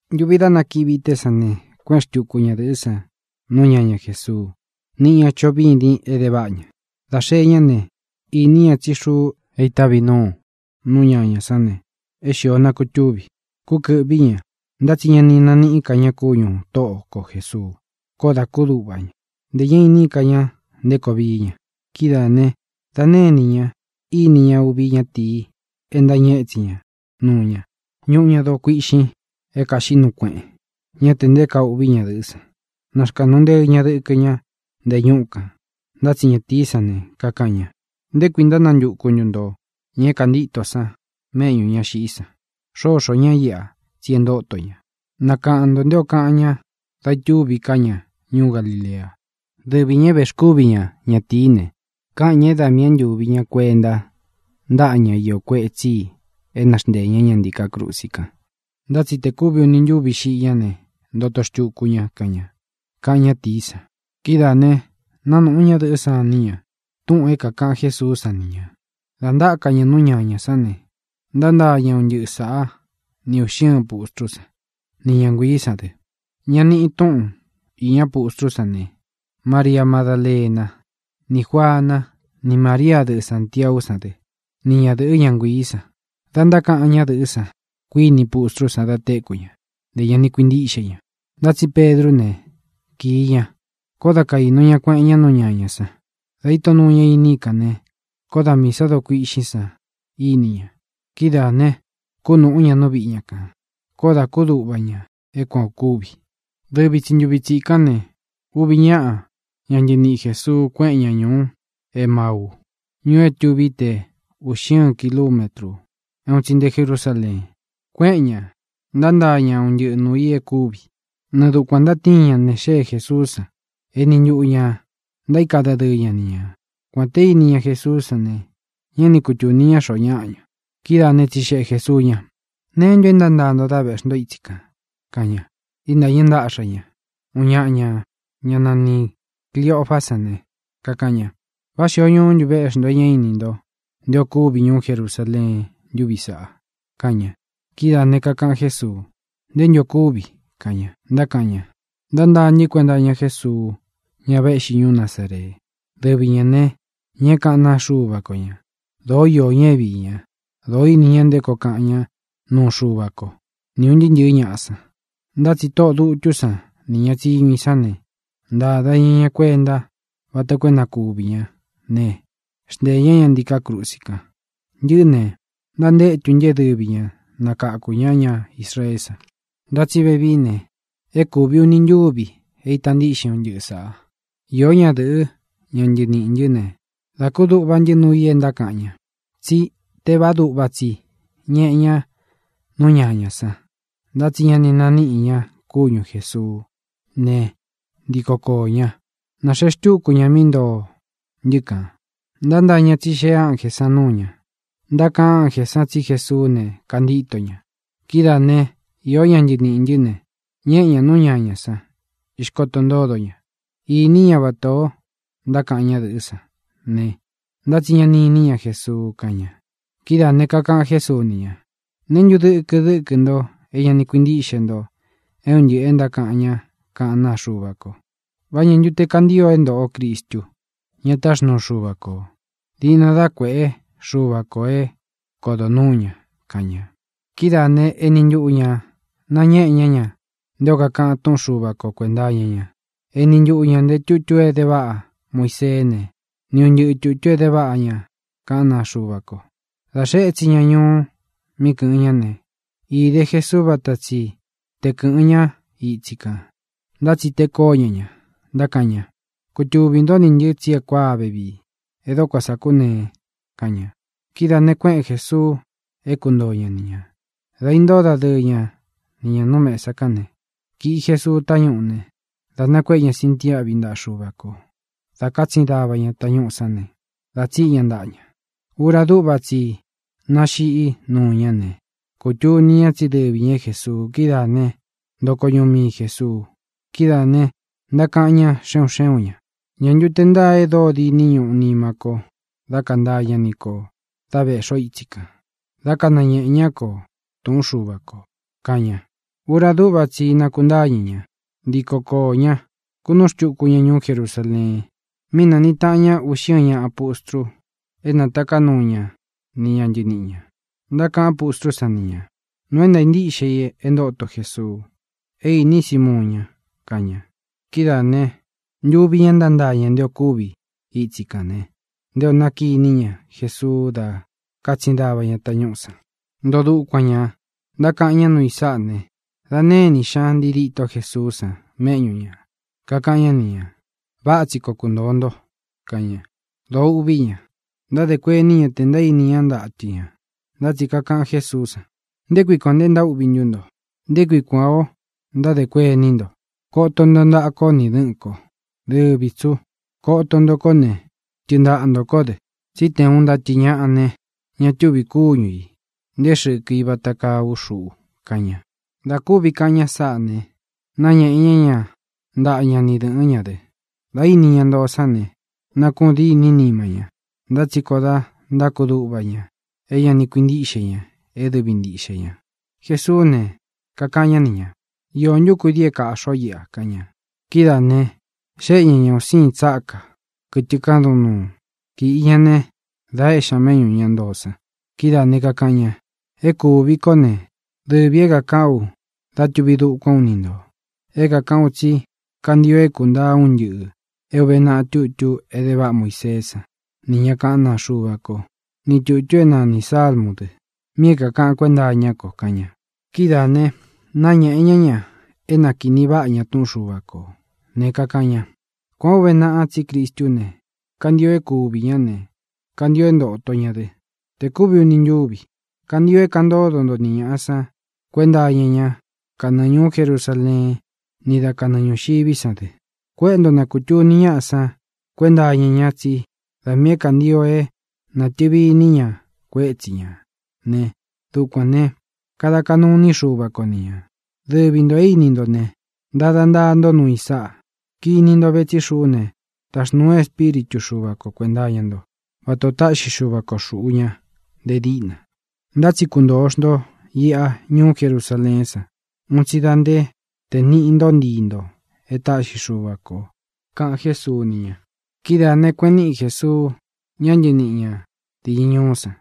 Ntuvi dá nakiꞌi o vīté san ne, kuéꞌen xtuku ñadɨ̄ꞌɨ́ san nú ñaña Jēsuu, niꞌi ña choꞌo vîdin é de váꞌa ña. Dā xee ñá ne, īní ña tsí xuu é ītávī núu nú ñañā sán ne, é xīo nakutúvi. Kúkɨ̄ꞌví ña, ntá tsi ña ni naníꞌi ka ña kúñū Tóꞌo ko Jēsuu. Koó dā kúduꞌva ña. Ntē ñá iní ka ña nté koo vií ña. Kidáā ne, da née inī ña íni ña uvi ñatīi é ntañɨ etsin ña nuu ña. Ñuꞌu ña doo kuíꞌxin é kāxiꞌí nuu kueꞌen. Ñá tē nté kaa uꞌví ñadɨ̄ꞌɨ́ san, naxkāꞌnu nteɨ ña dɨkɨ ña nte ñúꞌu kān. Ntá tsi ñatīí san ne, kakaꞌan ña: —¿Nté kui ntánantuku ntu nto ña é kāntíto san méꞌñū ña xiꞌí san? Xóxō ñá iꞌa, tsi e ntóto ña. Nakaꞌan ntō nté o kaꞌan ña dá itúvi ká ña ñuú Galilea. Dɨvi ñā é vēxkúvi ña ñatīí ne, kaꞌan ña é da miī é ntūvi ña kuenta ntáꞌa ñá iō kuetsí i é na xnteē ñá ña ntiká krusi kan. Ntá tsi tē kúvi uni ntúvi xiꞌi ñá ne, ntoto xtuku ña, kaꞌan ña —kaꞌan ñátīí san. Kidáā ne, nánūꞌu ñádɨ̄ꞌɨ́ san iní ña túꞌūn é kākaꞌan Jésuú san ni ñā. Dā ntáka ña nú ñañā sán ne, ntántaa ña un ntɨꞌɨ sāꞌá ni ūꞌxi ɨ́ɨn pustrú san, ni ña nguiī sán dɨ. Ña niꞌi túꞌun īña pustrú san ne: Maria Madálena, ní Juana, ni María, dɨꞌɨ Sāntiaú san dɨ, ni ñadɨ̄ꞌɨ́, ña nguiī san. Da ntákaꞌan ñádɨ̄ꞌɨ́ san, kuiní pustrú san da téku ña. Ntē ña ni kuintíꞌxe ña. Ntá tsi Pedrú ne, kīi ña, koó da kaīnu ña kueꞌen ñá nú ñañā san. Dā íto nuu ña iní i kān ne, koó da miī sá doo kuiꞌxín san íni ña. Kidáā ne, kúnūꞌú ña nú viꞌi ña kān. Koó dā kúduꞌva ña é kuan ō kúvi. Dɨvi tsi ntūvi tsikán ne, uvi ñáꞌa ña ntɨniꞌi Jēsuu kuéꞌen ña ñūú Emauu, ñuu é tuví te ūꞌxi ɨ́ɨn kilumétru é un tsi nté Jerusaleen. Kuéꞌen ñā, ntántaa ña un ntɨꞌɨ nuū i e kúvi. Nɨɨ dukuān ntatíin ña ne, xée Jēsuú san, eni ntuꞌu ñā ntaíka dadɨɨ ña ni ñā. Kuān te íni ña Jesuú san ne, ñá ni kutūni ña xoo ñáꞌa ña. Kidáā né, tsixeꞌe Jēsuu ña: —¿Neé ntu e ntántaa nto dā veꞌxí nto ítsi kān? —kaꞌan ña. Íntāñɨ́ ntaꞌxa ñā. Uun ñaꞌa ña, ñá nanī Cliofá san ne, kakaꞌan ña: —¿Vá xīo ñuú ntu véꞌxi nto e ñá ini nto nté ō kúvi ñuú Jerusaleen ntúvi saꞌa? —kaꞌan ña. Kidáā ne, kakaꞌan Jésuu: —¿Ntē ntu o kúvi? —kaꞌan ña. Ntákaꞌan ña: —Ntántaa ntɨ́ kuenta iña Jésuu, ña véꞌxi ñuú Nazaree. Dɨvi ñā ne, ña é kaꞌán naa Xuva ko ña. Dōó iō ña é viī ña; dōó ini ña nté koo kaꞌan ña núu Xuva ko, ni ūn ntɨɨ́ ntɨ̄ɨ́ ñaꞌa san. Ntá tsi tóꞌō dutú san nī ña tsiñu i sán ne, ntāda ña ña kuentá vata koo é na kuvī ñá ne, xnteē ñá ña ntiká krusi kan. Ntɨꞌɨ́ ne, ntantétu ntɨ é dɨvi ñā é nakakū ñá ña Israeé san. Ntá tsi vevií ne, é kūvi uni ntúvī é īta ntíꞌxin un ntɨꞌɨ sāꞌa. Iō ñá dɨ̄ꞌɨ́, ña ntɨniꞌī ntɨ́ ne, dā kúduꞌva ntɨ́ nuu i e ntákaꞌan ña. Tsí tevaá duꞌva tsi ñeꞌe ña nú ñañā san. Ntá tsi ña ni naníꞌi ña kúñu Jēsuú ne, ntiko koō ña, náxee xtúku ña mí ntoo ntɨ́ kān. Ntántaa ñā tsi xée ánjē san nuu ña. Ntákaꞌan ánjē san tsí Jesuú ne, kantíto ña. Kidáa ne, iō ñá ntɨniꞌī ntɨ́ ne, ñéꞌe ñā nú ñañā san, ixkoto ntódo ña. Īní ña vatā o ntákaꞌan ñádɨ̄ꞌɨ́ san ne, ntá tsi ña ni iní ña Jesuu —kaꞌan ña. Kidáā ne, kakaꞌan Jésuu ni ña: —¿Neé ntu dɨkɨ dɨ́kɨ nto é ña ni kuintíꞌxe nto é un ntɨꞌɨ̄ e ntákaꞌan ñá kaꞌán naa Xuva ko? ¿Vá ñā ntu te kantío é ntōꞌo Cristu, ña táxnuu Xuva kō, diꞌna dá kuēꞌé Xuva kō é kodo nuū ña? —kaꞌan ña. Kidáā né, eni ntuꞌu ñā nañéꞌe ñá ña nté o kakaꞌan túꞌun Xuva ko kuēnta iña ña. Eni ntuꞌu ñā nté tutu é de váꞌa Muiseé ne, ni un ntɨꞌɨ tūtu é de váꞌa ña kaꞌán naa Xuva ko. Dā xee étsin ña ñuú mí kɨ̄ꞌɨn ñá ne, íde Jesuú vata tsi te kɨ̄ꞌɨ́n ka ña itsi kān. Ntá tsi tee kóo ña ña, ntákaꞌan ña: —Kutuvī ntó nī ntɨ tsí e kuáa vevii. E dóko sā kúnee —kaꞌan ña. Kidáā ne, kuéꞌen Jēsuu é kuntoo ña ni ñā. Dā intóo dadɨɨ ña ni ñā nú mesa kán ne, kīꞌi Jesuu tañúꞌū ne, da nakuéꞌe ña sintiáꞌvi ntaꞌa Xuva kō. Dā kátsin dava ña tañúꞌū sán ne, dā tsíꞌi ña ntaꞌa ña. Ura dúꞌva tsi i náxiꞌi nuu ñá ne, kūtuni ña tsí dɨvi ñā é Jēsuu. Kidáā né, ntoko ñuꞌu mii Jēsuu. Kidáā ne, ntákaꞌan ñá xe un xé un ñā: —¿Ñā ntu te ntáa e dóo diní ñuꞌu nima kó dá kantaa ñá ni ko dā véꞌxi o ítsi kān, dá kanañēꞌe ñá kō túꞌun Xuva kō? —kaꞌan ña. Ura dúꞌva tsi i nakuntáñɨ ña, ntíko koō ñá, kūnúꞌu xtuku ña ñuú Jerusaleen, mí nāniꞌi taꞌan ña uꞌxi ɨ́ɨn ñaꞌa pustru é nātaká nuu ña ni ña ntɨniꞌi ñā. Ntákaꞌan pustrú san ni ñā: —Nuu é ntāa ntíꞌxe i e ntóto Jesuu. É īní Simuun ña —kaꞌan ña. Kidáā ne, ntuvi ña ntántaa ña nté ō kúvi itsi kān ne, nté ō nákiní ña Jesuú dā kátsin dava ña tañúꞌū san. Ntoo dukuan ñā, ntákaꞌan ñá nuu i sáꞌa ne, da née inī xñá ntii dîto Jesuú san méꞌñu ñā, kakaꞌan ñá ni ñā: —Váꞌa tsi koo kuntōo nto —kaꞌan ña. Dōó uꞌví ña. Ntádē kuení ña tē ntaíní ña ntatɨ ñā. Ntá tsi kakaꞌan Jésuú san: —¿Nté kui kuān nte ntaúꞌvī ntú nto? ¿Nté kui kuān ó ntádē kuení nto? Koto nto ntaꞌa kó ni dɨ̄ꞌɨ́n ko. Dɨvi tsī ú. Koto nto kó ne, tɨɨn ntaꞌa ntō kó dɨ, tsí te uun ntatɨ ñāꞌa ne, ña túvī kúñu ī, nté xɨkɨ i vata kaa ú xuꞌu —kaꞌan ña. Dā kúvi kaꞌan ña sáꞌā ne, náñēꞌe ñá ña ntaꞌa ña ni dɨ̄ꞌɨ́n ña dɨ. Dā íni ña ntoo sán ne, nakuꞌun dîní nima ñá, ntá tsi koó dā ntákuduꞌva ña é ña ni kuintíꞌxe ña é dɨvi ntiꞌxe ñā. Jesuú ne, kakaꞌan ñá ni ñā: —¿Īo ntú kudii é kāꞌxi ó iꞌa? —kaꞌan ña. Kidáā ne, xéꞌe ña ñā un síin tsákā, kɨtɨ kádun nuu. Kīꞌi ña né, dā éꞌxi ña méꞌñū ña ntoo san. Kidáā ne, kakaꞌan ña: —E kúvi kó ne, dɨvī é kākaꞌán u dá tūvi dukuan ú ni ntō. É kākaꞌán u tsí kantio é kūntaa un ntɨꞌɨ̄ é ūve naꞌa tutu é de váꞌa Muiseé san nī ña kaꞌán naa Xuva ko, ni tūtu é nanī Sálmū dɨ, mi é kākaꞌan kuénta iñá ko —kaꞌan ña. Kidáā ne, náñēꞌe ñá ña é nakīni váꞌa ña túꞌun Xuva kō ne, kakaꞌan ña: —Kuān ó uve naꞌa tsí Cristú ne, kantio é kuvī ñá ne, kantio é ntōto ña dɨ tē kúvi uni ntúvi. Kantio é kaꞌan ntódo nto ni ñāꞌa san kuénta iña ñá kanɨɨ ñūú Jerusaleen ni dá kanɨɨ ñūxiví san dɨ. Kuéꞌe nto na kūtuni ñáꞌa san kuénta iña ña tsí da miī é kantio é natɨ̄vi iní ña kuétsi ñā ne, dukuān ne, kada kaꞌnu iní Xuva ko ni ñā. Dɨvi ntō é ini nto ne, ntada ntaa ntó nuu i sáꞌa. Kiní nto ve tsí xuꞌú ne, taxnūu ú Espíritu Xuva ko kuēnta iña ntó, vatā o táꞌxi Xuva ko xūꞌu ña nte díꞌna. Ntá tsi kuntōo xnto iꞌa ñuú Jerusaleén san un tsi da nté tē niꞌi nto ntíi ntō é taꞌxi Xuva kō —kaꞌan Jésuu ni ña. Kidáā ne, kueꞌen níꞌi Jēsuu ña ntɨníꞌi ñā diñɨ ñuú san,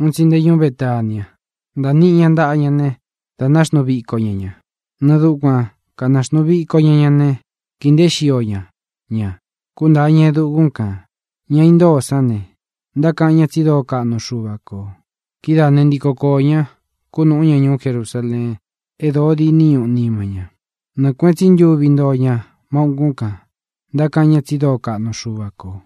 un tsi nte ñuú Betania. Ntāniꞌi ña ntaꞌa ña ne, dā náxnuu viko ña ña. Nɨɨ dukuan kānaxnuu viko ña ña ne, kīi nteé xio ña ña, kuntáa ña e dukún kān. Ña intóo sán ne, ntákaꞌan ña tsi dóo kaꞌnu Xuva kō. Kidáā né, ntiko koō ña, kunúꞌu ña ñuú Jerusaleen e dóo diní ñuꞌu nima ña. Nɨɨ kuēꞌen tsí ntuvi ntoo ña má ukún kān, ntákaꞌan ña tsi dóo kaꞌnu Xuva kō.